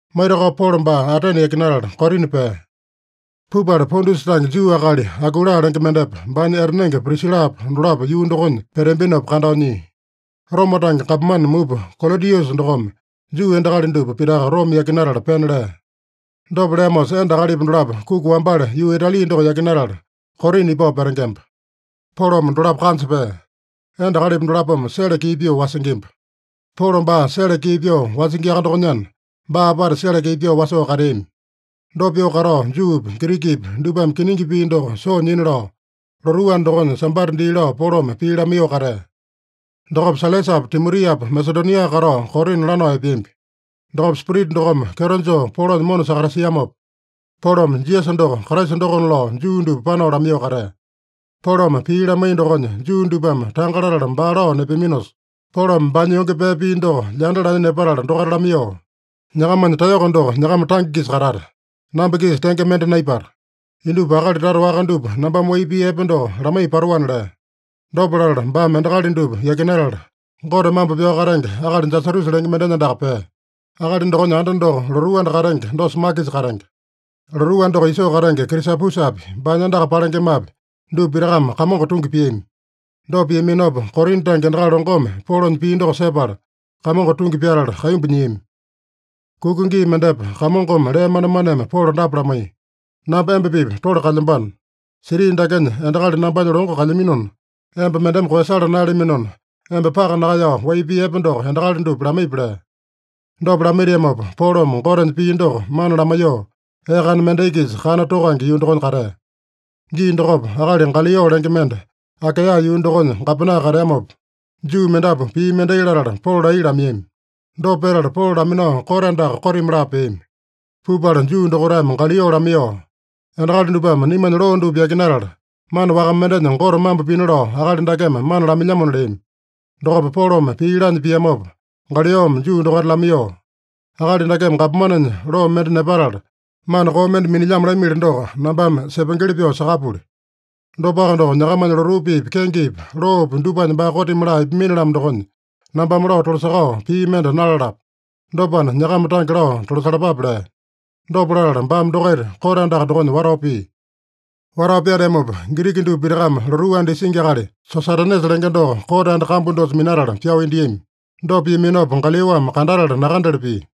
Maitakao Polo baa Atene yakinatala, Korina pea. Pupala Pontusa tange Juu akali Akuila lenge mendepa, baanya etanenge Prisilapa, dolapo yuu dokonya peteambinopa kandao nyia. Roma tange gapomane mupa Kolodiusa dokome Juu endakali dupa pitaka Roma yakinatala pena lea. Dopa leamosa, enda akalipa dolapo kuki wambale yuu Itali doko yakinatala, Korina ipao petengemba. Polome dolapo kanja pea. Enda akalipa dolapome sele kii pyoo wasingimba. Polo baa sele kii pyoo wasingiaka dokonyana, baa apata sele kii pyoo wasoo kateami. Dopa pyoo katao, Juupi, Girikipi dupame kiningi pii doko soo nyina lao, lotuu anda dokonya Sambata dii lao Polome pii lamaiyoo katea. Dokopa Sailasapa Timotiapa Masedonia katao Korina lanao epeambi. Dokopa Spirita dokome kyeto joo Polonya mona sakatasiamopa, Polome Jisasa doko Kraisa dokona lao Juu dupa panao lamaiyoo katea. Polome pii lamaiya dokonya Juu dupame tanga latala baa lao nepeaminosa, Polome baanya yonge pee pia doko lyanda lanya nepatala dokaita lamaiyoo, “Nyakamanya taeyoko doko nyakama tange-kisa katata. Namba-kisa tenge mende naipata. Indupa akali tata waka dupa nambame wai pii epe doko lamaiya patoana” lea. Dopa latala baame endakali dupa yakinatala, Gote mambo pyao katenge akali Jasatusa lenge mendenya andaka pea. Akali dokonya anda doko lotuu anda katenge dosa makisa katenge. Lotuu anda doko isoo katenge Krisapusapi, baanya andaka palengemapi, dupa pitakame Kamongo tungi piami. Dopa piaminopa, Korina tange endakali longome Polonya pii doko sepala, Kamongo tungi pyatala kaimbu nyiami. Kuka gii mendepa Kamongome lee manemaneme Polo dapa lamaiya: “Namba emba-pipa tole kalyambano. Siti dakenya endakali nambanya longo kalyaminona, emba mendeme koeyasala naeyalaminona, emba paka nakaeyao wai pii epe doko endakali dupa lamaipi” lea. Dopa lamaitiamopa, Polome Gotenya pii doko mana lamaiyoo, ee kana mendai-kisa kana tokange yuu dokonya katea. Gii dokopa, akali Galio lenge mende Akaeya yuu dokonya gapena kateamopa, Juu mendapu pii mendai latala Polo laiya lamaiyami. Dopa petala Polo laminao kote andaka kotimi laa peami. Pupala Juu dokaitame Galio lamaiyoo, “Endakali dupame naimanya loo dupa yakinatala, mana waka mendenya Gote mambo pina lao akali dakeme mana lamailyamona” leami. Dokopa Polome pii laanya piamopa, Galiome Juu dokaita lamaiyoo, “Akali dakeme gapomanenya loo mende nepatala, mana koo mende minilyamo lamili doko, nambame sepengeli pyoo sakapuli. Dopaka doko, nyakamanya lotuu piipi, kengepi, loopi dupanya baa kotimi laa ipamini-lamo dokonya, nambame lao tolasakao pii mende nalalapo. Dopana, nyakama tange lao tolasalapape” lea. Dopa latala baame dokaita kote andaka dokonya watao pia. Watao pyateamopa, Giriki dupa pitakame lotuu anda isingi akali Sosatenesa lenge doko kote anda kambu dosa minatala pyao indiami. Dopa piaminopa, Galiome kandatala nakandele pia.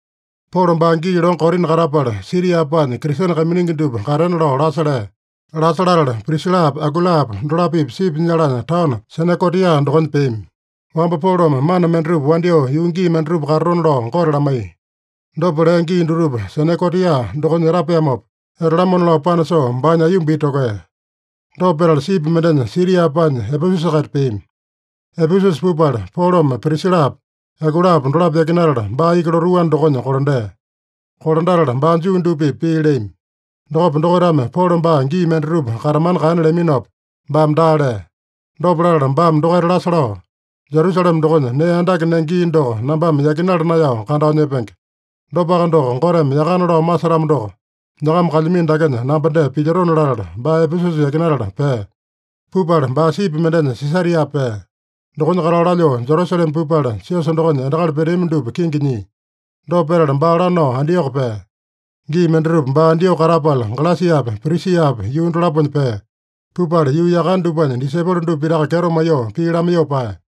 Polo baa gii longo Korina katapala, Siria paanya Kristene kaiminingi dupa katena lao lasa lea. Lasa latala, Prisilapa Akuilapa dolapo-pipa sipi nyalanya taono Senekotia dokonya peami. (Wamba Polome mana mendatupa wandyoo yuu gii mendatupa katatona lao Gote lamaiya. Dopa lea gii dutupa Senekotia dokonya etapeamopa, etalamona lao panasoo baanya aiyomba iti tokea.) Dopa petala sipi mendenya Siria paanya Epesusa-kaita peami. Epesusa pupala, Polome Prisilapa Akuilapa dolapo yakinatala, baa iki lotuu anda dokonya kolandea. Kolandatala baa Juu dupa-pipa pii leami. Dokopa dokaitame Polo baa gii mendatupa katamana kaena leaminopa, baame daa lea. Dopa latala baame dokaita lasa lao, “Jerusalema dokonya nee andake nenge gii doko nambame yakinala naeyao kandao nyepenge. Dopaka doko, Goteme yakana lao masetamo doko, nyakama kalyamino dakenya namba dee pilyotona” latala baa Epesusa yakinatala pea. Pupala baa sipi mendenya Sisaria pea. Dokonya katao lalyoo Jerusalema pupala, siosa dokonya endakali peteami dupa kingi nyia. Dopa petala baa lanao Antioko pea. Gii mendatupa baa Antioko katapala, Galesiapa Prisiapa yuu dolaponya pea. Pupala yuu yakane dupanya disaipolo dupa pitaka kyeto maiyoo pii lamaiyoo paeya.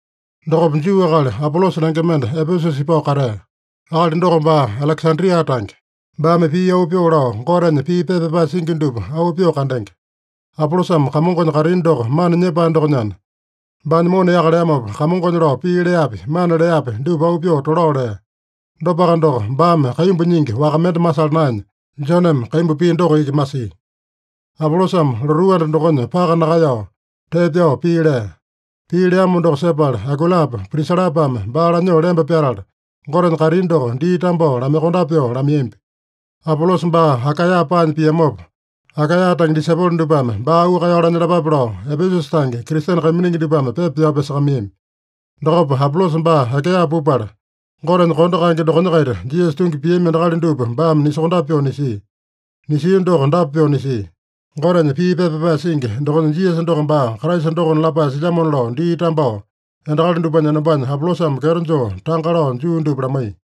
Dokopa Juu akali Apolosa lenge mende Epesusa ipao katea. Akali doko baa Alekesandria tange. Baame pii auu pyoo lao, Gotenya pii pepa pyapae singi dupa auu pyoo kandenge. Apolosame Kamongonya kaitini doko mana nyepae dokonyana, baanya mona yaka leamopa, Kamongonya lao pii leapi, mana leapi dupa auu pyoo tolao lea. Dopaka doko, baame kaimbu nyingi waka mende masala naenya, Joneme kaimbu pia doko iki masia. Apolosame lotuu anda dokonya paka nakaeyao, tee pyao pii lea. Pii leamo doko sepala, Akuilapa Prisilapame baa lanyoo lemba pyatala, Gotenya kaitini doko dii tambao lamaiyokondape pyoo lamaiyambi. Apolosa baa Akaeya paanya piamopa, Akaeya tange disaipolo dupame baa auu kaeyao lanyalapape lao, Epesusa tange Kristene kaiminingi dupame pepa pyao pyasakamaiyami. Dokopa Apolosa baa Akaeya pupala, Gotenya kondo kaenge dokonya-kaita Jisasa tungi piami endakali dupa baame nisokondape pyoo nisia. Nisia doko dapa pyoo nisia: Gotenya pii pepa pyapae singi dokonya Jisasa doko baa Kraisa dokona lapae silyamona lao dii tambao, endakali dupanya enombanya Apolosame kyeto joo tanga lao Juu dupa lamaiya.